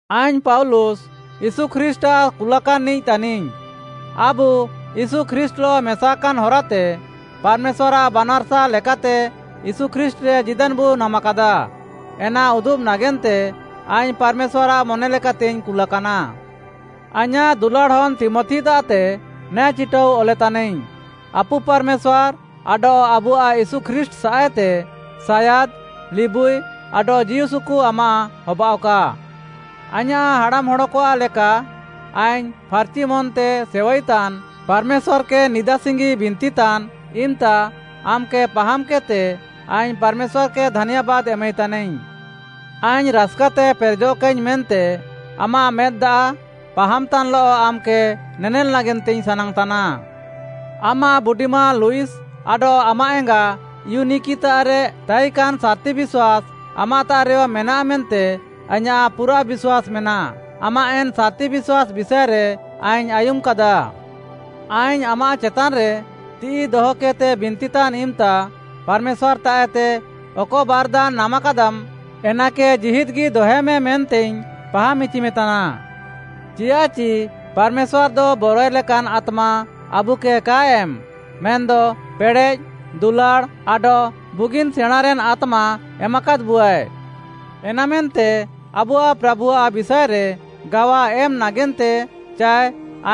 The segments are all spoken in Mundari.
ଆଇଙ୍ଗ୍‌ ପାଉଲୁସ୍‌, ୟୀଶୁ ଖ୍ରୀଷ୍ଟ୍‌ଆଃ କୁଲାକାନ୍‌ନିଃ ତାନିଙ୍ଗ୍‌। ଆବୁ ୟୀଶୁ ଖ୍ରୀଷ୍ଟ୍‌ଲଃ ମେସାକାନ୍‌ ହରାତେ ପାର୍‌ମେଶ୍ୱାର୍‌ଆଃ ବାନାର୍‌ସା ଲେକାତେ ୟୀଶୁ ଖ୍ରୀଷ୍ଟ୍‌ରେ ଜୀଦାନ୍‌ବୁ ନାମାକାଦା। ଏନା ଉଦୁବ୍‌ ନାଗେନ୍ତେ ଆଇଙ୍ଗ୍‌ ପାର୍‌ମେଶ୍ୱାର୍‌ଆଃ ମନେଲେକାତେଇଙ୍ଗ୍‌ କୁଲାକାନା। ଆଇଁୟାଃ ଦୁଲାଡ଼୍‌ ହନ୍‌ ତୀମଥିତାଃତେ ନେ ଚିଟାଉ ଅଲେତାନାଇଙ୍ଗ୍‌। ଆପୁ ପାର୍‌ମେଶ୍ୱାର୍‌ ଆଡଃ ଆବୁଆଃ ୟୀଶୁ ଖ୍ରୀଷ୍ଟ୍‌ସାଃଏତେ ସାୟାଦ୍‌, ଲିବୁଇ ଆଡଃ ଜୀଉସୁକୁ ଆମାଃ ହବାଅଃକା। ଆଇଁୟାଃ ହାଡ଼ାମ୍‌ହଡ଼କଆଃ ଲେକା ଆଇଙ୍ଗ୍‌ ଫାର୍‌ଚି ମନ୍‌ତେ ସେୱାଇତାନ୍‌ ପାର୍‌ମେଶ୍ୱାର୍‌କେ ନିଦାସିଙ୍ଗି ବିନ୍ତିତାନ୍‌ ଇମ୍‌ତା ଆମ୍‌କେ ପାହାମ୍‌କେଦ୍‌ତେ ଆଇଙ୍ଗ୍‌ ପାର୍‌ମେଶ୍ୱାର୍‌କେ ଧାନ୍ୟାବାଦ୍‌ ଏମାଇତାନିଙ୍ଗ୍‌। ଆଇଙ୍ଗ୍‌ ରାସ୍‌କାତେ ପେରେଜଃକାଇଙ୍ଗ୍‌ ମେନ୍ତେ ଆମାଃ ମେଦ୍‌ ଦାଆଃ ପାହାମ୍‍ତାନ୍‍ଲଃ ଆମ୍‌କେ ନେଲ୍‌ ନାଗେନ୍ତେଇଙ୍ଗ୍‌ ସାନାଙ୍ଗ୍‌ ତାନା। ଆମାଃ ବୁଡିମାଁ ଲଇସ୍‌ ଆଡଃ ଆମାଃ ଏଙ୍ଗା ଇଉନିକିତାଃରେ ତାଇକାନ୍‌ ସାର୍‌ତି ବିଶ୍ୱାସ୍‌ ଆମାଃତାଃରେୟ ମେନାଃ ମେନ୍ତେ ଆଇଁୟାଃ ପୁରାଃ ବିଶ୍ୱାସ୍‌ ମେନାଃ, ଆମାଃ ଏନ୍‌ ସାର୍‌ତି ବିଶ୍ୱାସ୍‌ ବିଷାଏରେ ଆଇଙ୍ଗ୍‌ ଆୟୁମ୍‌କାଦା। ଆଇଙ୍ଗ୍‌ ଆମାଃ ଚେତାନ୍‌ରେ ତିଃଇ ଦହକେଦ୍‌ତେ ବିନ୍ତିତାନ୍‌ ଇମ୍‌ତା ପାର୍‌ମେଶ୍ୱାର୍‌ତାଃଏତେ ଅକ ବାର୍‌ଦାନ୍‌ ନାମାକାଦାମ୍‌ ଏନାକେ ଜୀହିଦ୍‌ଗି ଦହେମେ, ମେନ୍ତେଇଙ୍ଗ୍‌ ପାହାମ୍‌ଇଚିମେ ତାନା। ଚିୟାଃଚି ପାର୍‌ମେଶ୍ୱାର୍‌ଦ ବରଏଲେକାନ୍‌ ଆତ୍ମା ଆବୁକେ କାଏ ଏମ୍‌, ମେନ୍‌ଦ ପେଡ଼େଃ, ଦୁଲାଡ଼୍‌ ଆଡଃ ବୁଗିନ୍‌ ସେଣାଁଁନ୍‍ରେନ୍ ଆତ୍ମା ଏମାକାଦ୍‌ବୁଆଏ। ଏନାମେନ୍ତେ ଆବୁଆଃ ପ୍ରାଭୁଆଃ ବିଷାଏରେ ଗାୱା ଏମ୍‌ ନାଗେନ୍ତେ ଚାଏ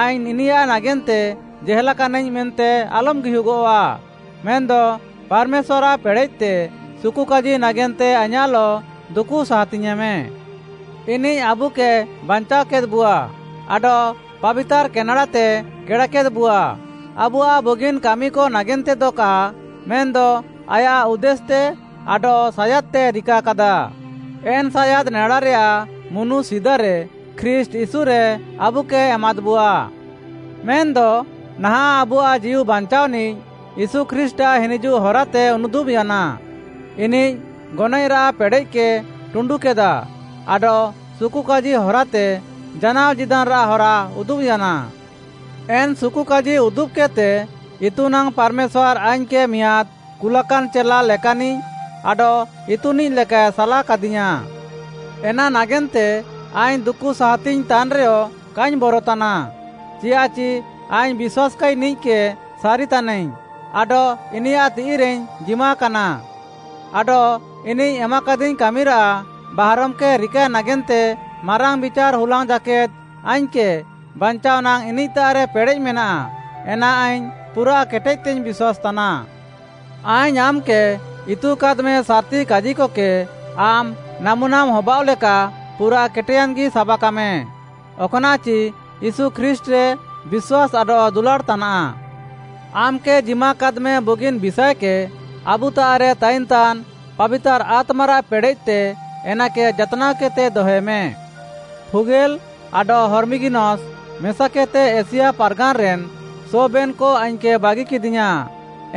ଆଇଙ୍ଗ୍‌ ଇନିୟାଃ ନାଗେନ୍ତେ ଜେହେଲ୍‌କାନାଇଙ୍ଗ୍‌ ମେନ୍ତେ ଆଲମ୍‌ ଗିହୁଗଃଆ, ମେନ୍‌ଦ ପାର୍‌ମେଶ୍ୱାର୍‌ଆଃ ପେଡ଼େଃତେ ସୁକୁକାଜି ନାଗେନ୍ତେ ଆଇଁୟାଃଲଃ ଦୁକୁ ସାହାତିଙ୍ଗ୍‌ୟେଁମେ। ଇନିଃ ଆବୁକେ ବାଞ୍ଚାଅକେଦ୍‌ବୁଆ ଆଡଃ ପାବିତାର୍‌ କେନେଡ଼ାତେ କେଡ଼ାକେଦ୍‌ବୁଆ, ଆବୁଆଃ ବୁଗିନ୍‌ କାମିକ ନାଗେନ୍ତେଦ କା ମେନ୍‌ଦ ଆୟାଃ ଉଦ୍ଦେଶ୍‌ତେ ଆଡଃ ସାୟାଦ୍‍ତେ ରିକାକାଦା, ଏନ୍‌ ସାୟାଦ୍‌ ନେଡାରେୟାଃ ମୁନୁ ସିଦାରେ ଖ୍ରୀଷ୍ଟ୍‌ ୟୀଶୁରେ ଆବୁକେ ଏମାଦ୍‍ବୁଆ। ମେନ୍‌ଦ ନାହାଁଃ ଆବୁଆଃ ଜୀଉ ବାଞ୍ଚାଅନିଃ ୟୀଶୁ ଖ୍ରୀଷ୍ଟ୍‌ଆଃ ହିନିଜୁଃ ହରାତେ ଉନୁଦୁବ୍‌ୟାନା, ଇନିଃ ଗନଏଃରାଃ ପେଡ଼େଃକେ ଟୁଣ୍ଡୁକେଦା ଆଡଃ ସୁକୁକାଜି ହରାତେ ଜାନାଅ ଜୀଦାନ୍‌ରାଃ ହରା ଉଦୁବ୍‌ୟାନା। ଏନ୍‌ ସୁକୁକାଜି ଉଦୁବ୍‌କେଦ୍‌ତେ ଇତୁନାଙ୍ଗ୍‌ ପାର୍‌ମେଶ୍ୱାର୍‌ ଆଇଙ୍ଗ୍‌କେ ମିଆଁଦ୍‌ କୁଲାକାନ୍‌ ଚେଲା ଲେକାନିଃ ଆଡଃ ଇତୁନିଃଲେକାଏ ସାଲାକାଦିୟାଁ। ଏନା ନାଗେନ୍ତେ ଆଇଙ୍ଗ୍‌ ଦୁକୁ ସାହାତିଙ୍ଗ୍‌ ତାନ୍‌ରେୟ କାଇଙ୍ଗ୍‌ ବରତାନା। ଚିୟାଃଚି ଆଇଙ୍ଗ୍‌ ବିଶ୍ୱାସ୍‌କାଇନିଃକେ ସାରିତାନାଇଙ୍ଗ୍‌ ଆଡଃ ଇନିୟାଃ ତିଃଇରେଇଙ୍ଗ୍‌ ଜିମାକାନା। ଆଡଃ ଇନିଃ ଏମାକାଦିଙ୍ଗ୍‌ କାମିରାଃ ବାହାରମ୍‌କେ ରିକାଏ ନାଗେନ୍ତେ ମାରାଙ୍ଗ୍‌ ବିଚାର୍‌ ହୁଲାଙ୍ଗ୍‌ ଜାକେଦ୍‌ ଆଇଙ୍ଗ୍‌କେ ବାଞ୍ଚାଅ ନାଙ୍ଗ୍‌ ଇନିଃତାଃରେ ପେଡ଼େଃ ମେନାଃ, ଏନା ଆଇଙ୍ଗ୍‌ ପୁରା କେଟେଦ୍‌ତେଇଙ୍ଗ୍‌ ବିଶ୍ୱାସ୍‌ତାନା। ଆଇଙ୍ଗ୍‌ ଆମ୍‌କେ ଇତୁକାଦ୍‌ମେ ସାର୍‌ତି କାଜିକକେ ଆମ୍‌ ନାମୁନାମ୍‌ ହବାଅଃଲେକା ପୁରା କେଟେୟାନ୍‌ଗି ସାବାକାମେ। ଅକ୍‌ନାଃଚି ୟୀଶୁ ଖ୍ରୀଷ୍ଟ୍‌ରେ ବିଶ୍ୱାସ୍‌ ଆଡଃ ଦୁଲାଡ଼୍‌ତାନାଃ। ଆମ୍‌କେ ଜିମାକାଦ୍‌ମେ ବୁଗିନ୍‌ ବିଷାଏକେ ଆବୁତାଃରେ ତାଇନ୍‌ତାନ୍‌ ପାବିତାର୍‌ ଆତ୍ମାରାଃ ପେଡ଼େଃତେ ଏନାକେ ଯାତ୍‌ନାଅ କେଦ୍‌ତେ ଦହେମେ। ଫୁଗେଲ୍‌ ଆଡଃ ହର୍ମଗିନସ୍‌ ମେସାକେଦ୍‌ତେ ଏସିଆ ପାର୍‌ଗାନ୍‌ରେନ୍‌ ସବେନ୍‌କ ଆଇଙ୍ଗ୍‌କେ ବାଗିକେଦିୟାଁ,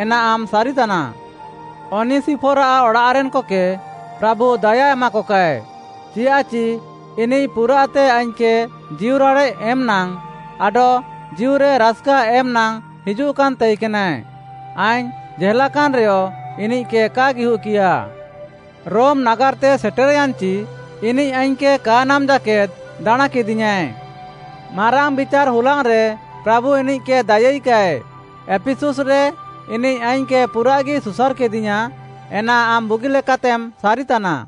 ଏନା ଆମ୍‌ ସାରିତାନା। ଅନିସିଫର୍‌ଆଃ ଅଡ଼ାଃରେନ୍‌କକେ ପ୍ରାଭୁ ଦାୟା ଏମାକକାଏ, ଚିୟାଃଚି ଇନିଃ ପୁରାଃତେ ଆଇଙ୍ଗ୍‌କେ ଜୀଉରାଡ଼େଃ ଏମ୍‌ନାଙ୍ଗ୍‌ ଆଡଃ ଜୀଉରେ ରାସ୍‌କା ଏମ୍‌ନାଙ୍ଗ୍‌ ହିଜୁଃକାନ୍‌ ତାଇକେନାଏ। ଆଇଙ୍ଗ୍‌ ଜେହେଲ୍‌କାନ୍‌ରେୟ ଇନିଃକେ କା ଗିହୁଃକିୟା। ରୋମ୍‌ ନାଗାର୍‌ତେ ସେଟେର୍‌ୟାନ୍‌ଚି ଇନିଃ ଆଇଙ୍ଗ୍‌କେ କା ନାମ୍‌ ଜାକେଦ୍‌ ଦାଣାଁଁକେଦିୟାଁଏ। ମାରାଙ୍ଗ୍‌ ବିଚାର୍‌ ହୁଲାଙ୍ଗ୍‌ରେ ପ୍ରାଭୁ ଇନିଃକେ ଦାୟାଇକାଏ। ଏଫିସୁସ୍‌ରେ ଇନିଃ ଆଇଙ୍ଗ୍‌କେ ପୁରାଃଗି ସୁସାର୍‌କେଦିୟାଁ, ଏନା ଆମ୍‌ ବୁଗିଲେକାତେମ୍ ସାରିତାନା।